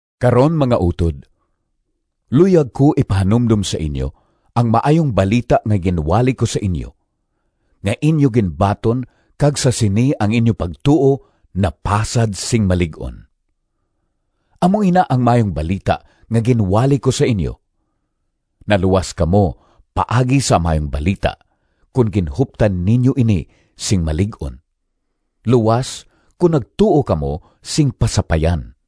Karon, mga utod, luyag ko ipahanumdom sa inyo ang Maayong Balita nga ginwali ko sa inyo, nga inyo ginbaton kag sa sini ang inyo pagtuo napasad sing malig-on. Amo ina ang Maayong Balita nga ginwali ko sa inyo. Naluwas kamo paagi sa Maayong Balita kon ginhuptan ninyo ini sing malig-on, luas kon nagtuo kamo sing pasapayan.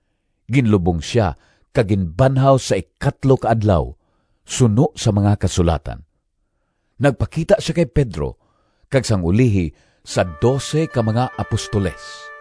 Ginlubong sia kag ginbanhaw sa ikatlo ka adlaw, suno sa mga Kasulatan. Nagpakita sia kay Pedro, kag sang ulihi sa dose ka mga apostoles.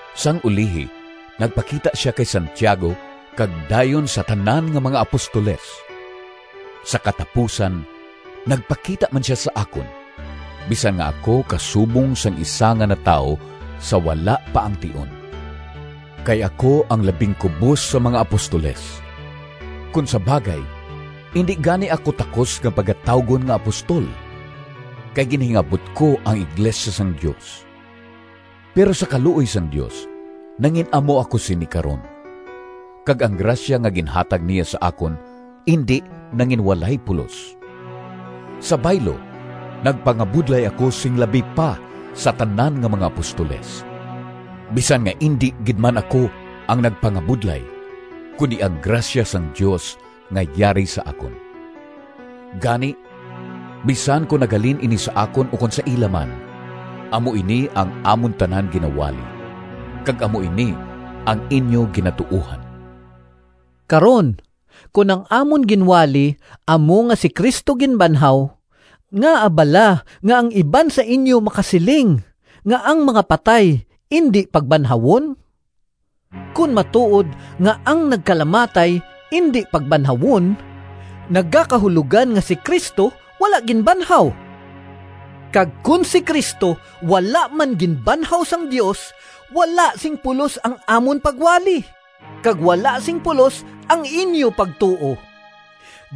Sang ulihi nagpakita sia kay Santiago kag dayon sa tanan nga mga apostoles. Sa katapusan nagpakita man sia sa akon, bisan nga ako kasubong sang isa nga natawo sa wala pa ang tion. Kay ako ang labing kubos sa mga apostoles. Kon sa bagay, indi gani ako takos nga pagatawgon nga apostol, kay ginhingabot ko ang iglesia sang Dios. Pero sa kaluoy sang Dios nangin-amo ako sini karon, kag ang grasya nga ginhatag niya sa akon indi nanginwalay pulos. Sa baylo, nagpangabudlay ako sing labi pa sa tanan nga mga apostoles, bisan nga indi gid man ako ang nagpangabudlay, kundi ang grasya sang Dios nga yari sa akon. Gani, bisan kon naghalin ini sa akon ukon sa ila man, amo ini ang amon tanan ginawali, kag amo ini ang inyo ginatuohan. Karon, kon ang amon ginwali amo nga si Cristo ginbanhaw, ngaa bala nga ang iban sa inyo makasiling nga ang mga patay indi pagbanhawon? Kon matuod nga ang nagkalamatay indi pagbanhawon, nagakahulogan nga si Cristo wala ginbanhaw. Kag kon si Cristo wala man ginbanhaw sang Dios, wala sing pulos ang amon pagwali, kag wala sing pulos ang inyo pagtuo.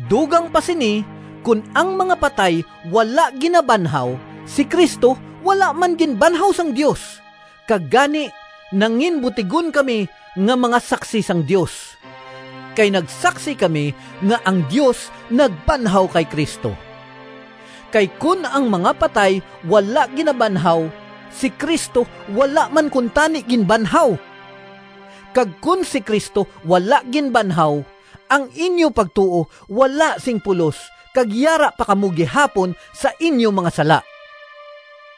Dugang pa sini, kon ang mga patay wala ginabanhaw, si Cristo wala man ginbanhaw sang Dios, kag gani nanginbutigon kami nga mga saksi sang Dios, kay nagsaksi kami nga ang Dios nagbanhaw kay Cristo. Kay kon ang mga patay wala ginabanhaw, si Cristo wala man kuntani ginbanhaw. Kag kon si Cristo wala ginbanhaw, ang inyo pagtuo wala sing pulos kag yara pa kamo gihapon sa inyo mga sala.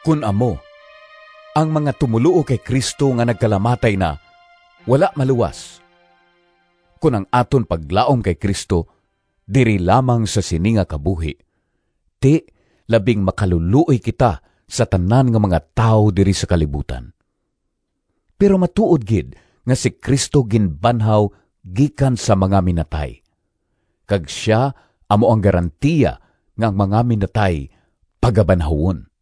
Kon amo, ang mga tumoluo kay Cristo nga nagkalamatay na wala maluwas. Kon ang aton paglaom kay Cristo diri lamang sa sini nga kabuhi, ti, labing makalulooy kita sa tanan nga mga tawo diri sa kalibutan. Pero matuod gid nga si Cristo ginbanhaw gikan sa mga minatay, kag sia amo ang garantiya nga ang mga minatay pagabanhawon.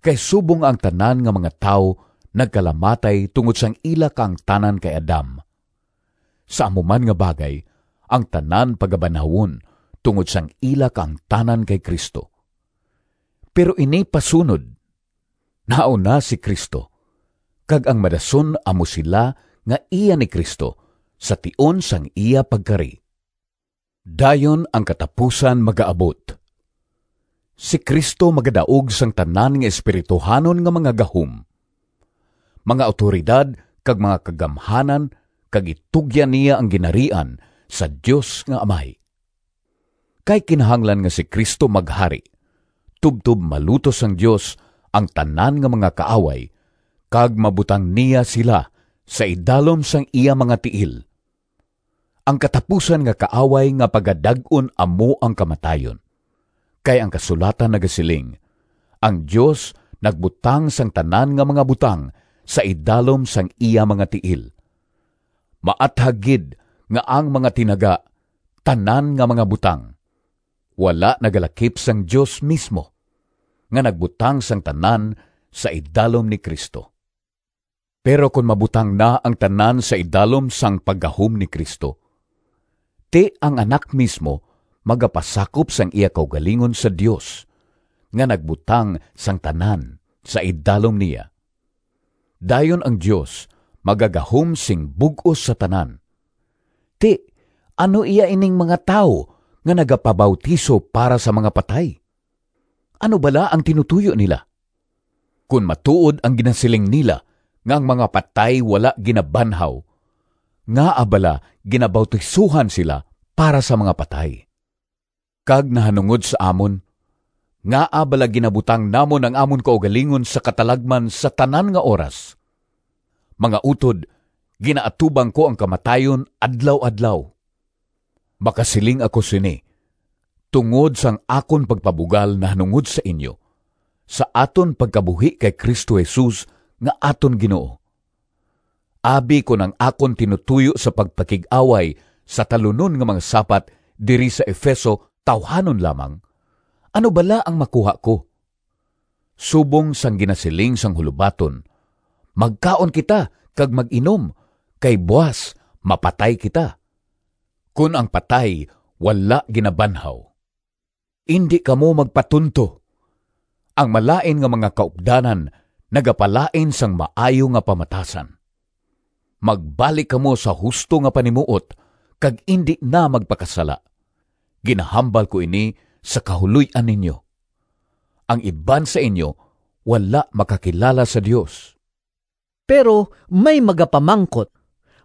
Kay subong nga ang tanan nga mga tawo nagkalamatay tungod sang ila kaangtanan kay Adam, sa amo man nga bagay, ang tanan pagabanhawon tungod sang ila kaangtanan kay Cristo. Pero ini pasunod: nahauna si Cristo, kag ang madason amo sila nga iya ni Cristo sa tion sang iya pagkari. Dayon ang katapusan magaabot. Si Cristo magadaog sang tanan nga espirituhanon nga mga gahom, mga awtoridad kag mga kagamhanan kag itugyan niya ang Ginharian sa Dios nga Amay. Kay kinahanglan nga si Cristo maghari, tubtob malutos sang Dios ang tanan nga mga kaaway kag mabutang niya sila sa idalom sang iya mga tiil. Ang katapusan nga kaaway nga pagadag-on amo ang kamatayon. Kay ang kasulatan nagasiling, “Ang Dios nagbutang sang tanan nga mga butang sa idalom sang iya mga tiil.” Maathag gid nga ang mga tinaga “tanan nga mga butang” wala nagalakip sang Dios mismo nga nagbutang sang tanan sa idalom ni Cristo. Pero kon mabutang na ang tanan sa idalom sang paggahom ni Cristo, ti, ang Anak mismo magapasakop sang iya kaugalingon sa Dios nga nagbutang sang tanan sa idalom niya. Dayon ang Dios magagahom sing bug-os sa tanan. Ti, ano iya ining mga tawo nga nagapabautiso para sa mga patay? Ano bala ang tinutoyo nila? Kon matuod ang ginasiling nila nga ang mga patay wala ginabanhaw, ngaa bala ginabautisohan sila para sa mga patay? Kag nahanungod sa amon, ngaa bala ginabutang namon ang amon kaugalingon sa katalagman sa tanan nga oras? Mga utod, ginaatubang ko ang kamatayon adlaw-adlaw! Makasiling ako sini tungod sang akon pagpabugal nahanungod sa inyo sa aton pagkabuhi kay Cristo Jesus nga aton Ginoo. Abi kon ang akon tinutoyo sa pagpakig-away sa “talunon nga mga sapat” diri sa Efeso tawuhanon lamang, ano bala ang makuha ko? Subong sang ginasiling sang hulobaton, “Magkaon kita kag mag-inom, kay buas mapatay kita”—kon ang patay wala ginabanhaw. Indi kamo magpatunto. “Ang malain nga mga kaupdanan nagapalain sang maayo nga pamatasan.” Magbalik kamo sa husto nga panimuot kag indi na magpakasala. Ginahambal ko ini sa kahuloy-an ninyo: ang iban sa inyo wala makakilala sa Dios. Pero may magapamangkot,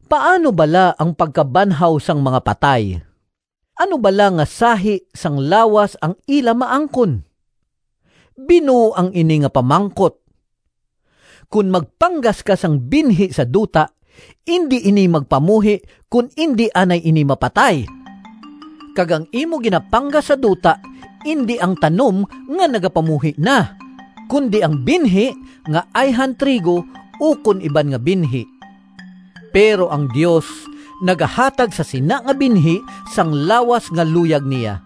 “Paano bala ang pagkabanhaw sang mga patay? Ano bala nga sahi sang lawas ang ila maangkon?” Binuang ini nga pamangkot! Kon magpanggas ka sang binhi sa duta, indi ini magpamuhi kon indi anay ini mapatay. Kag ang imo ginapanggas sa duta indi ang tanom nga nagapamuhi na, kundi ang binhi, nga ayhan trigo ukon iban nga binhi. Pero ang Dios nagahatag sa sina nga binhi sang lawas nga luyag niya.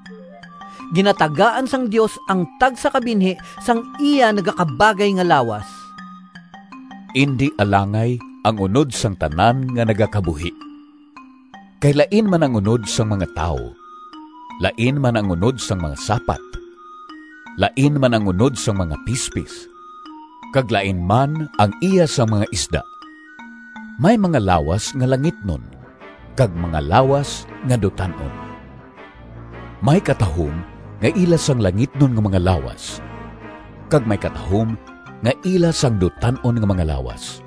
Ginatagaan sang Dios ang tagsa ka binhi sang iya nagakabagay nga lawas. Indi alangay ang unod sang tanan nga nagakabuhi. Kay lain man ang unod sang mga tawo, lain man ang unod sang mga sapat, lain man ang unod sang mga pispis, kag lain man ang iya sang mga isda. May mga lawas nga langitnon kag mga lawas nga dutan-on. May katahom nga ila sang langitnon nga mga lawas kag may katahom nga ila sang dutan-on nga mga lawas.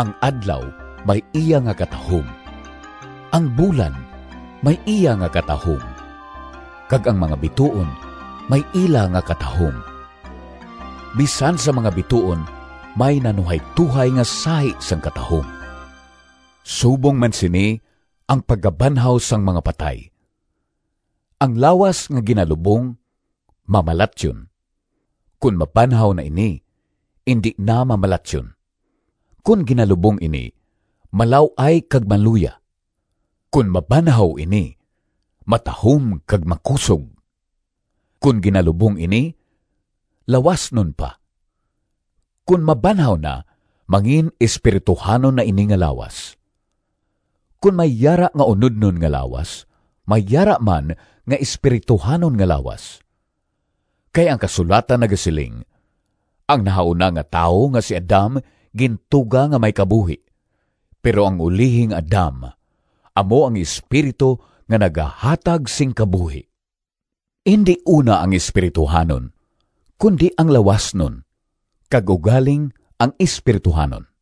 Ang adlaw may iya nga katahom, ang bulan may iya nga katahom, kag ang mga bituon may ila nga katahom. Bisan sa mga bituon may nanuhaytohay nga sahi sang katahom. Subong man sini ang pagkabanhaw sang mga patay. Ang lawas nga ginalubong mamalatyon. Kon mabanhaw na ini, indi na mamalatyon. Kon ginalubong ini, malaw-ay kag maluya. Kon mabanhaw ini, matahom kag makusog. Kon ginalubong ini, lawasnon pa. Kon mabanhaw na, mangin-espirituhanon na ini nga lawas. Kon may yara nga unodnon nga lawas, may yara man nga espirituhanon nga lawas. Kay ang kasulatan nagasiling, “Ang nahauna nga tawo nga si Adam gintuga nga may kabuhi.” Pero ang ulihi nga Adam amo ang Espiritu nga nagahatag sing kabuhi. Indi una ang espirituhanon, kundi ang lawasnon, kag ugaling ang espirituhanon.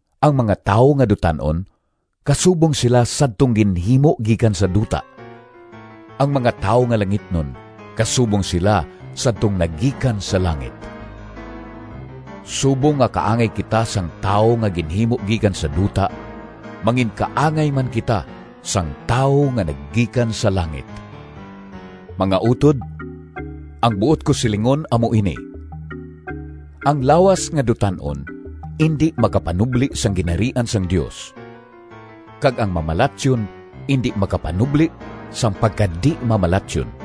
Ang mga tawo nga dutan-on kasubong sila sadtong ginhimo gikan sa duta. Ang mga tawo nga langitnon kasubong sila sadtong nagikan sa langit. Subong nga kaangay kita sang tawo nga ginhimo gikan sa duta, manginkaangay man kita sang Tawo nga nagikan sa langit. Mga utod, ang buot ko silingon amo ini: ang lawas nga dutan-on indi makapanubli sang Ginharian sang Dios, kag ang mamalatyon indi makapanubli sang pagkadi-mamalatyon.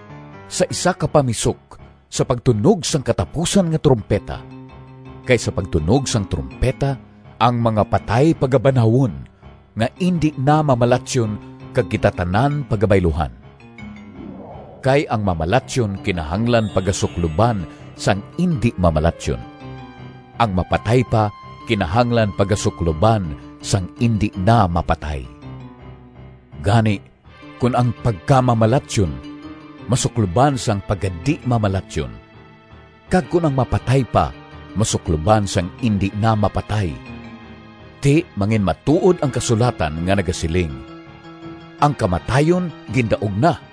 sa isa ka pamisok, sa pagtunog sang katapusan nga trumpeta. Kay sa pagtunog sang trumpeta, ang mga patay pagabanhawon nga indi na mamalatyon kag kita tanan pagabayluhan. Kay ang mamalatyon kinahanglan pagasukloban sang indi mamalatyon. Ang mapatay pa kinahanglan pagasukloban sang indi na mapatay. Gani kon ang pagkamamalatyon masukloban sang pagkadi-mamalatyon, kag kon ang mapatay pa masukloban sang indi na mapatay, ti, manginmatuod ang kasulatan nga nagasiling, “Ang Kamatayon gindaog na!”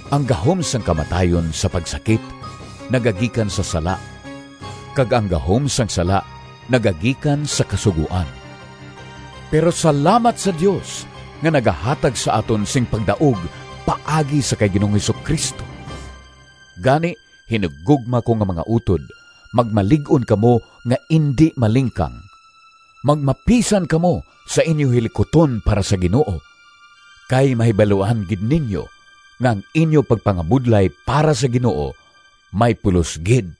Ang gahom sang kamatayon sa pagsakit nagagikan sa sala, kag ang gahom sang sala nagagikan sa Kasugoan. Pero salamat sa Dios nga nagahatag sa aton sing pagdaog paagi sa kay Ginoong Jesu-Cristo! Gani, hinigugma ko nga mga utod, magmalig-on kamo nga indi malingkang. Magmapisan kamo sa inyo hilikuton para sa Ginoo, kay mahibaluan gid ninyo nga ang inyo pagpangabudlay para sa Ginoo may pulos gid.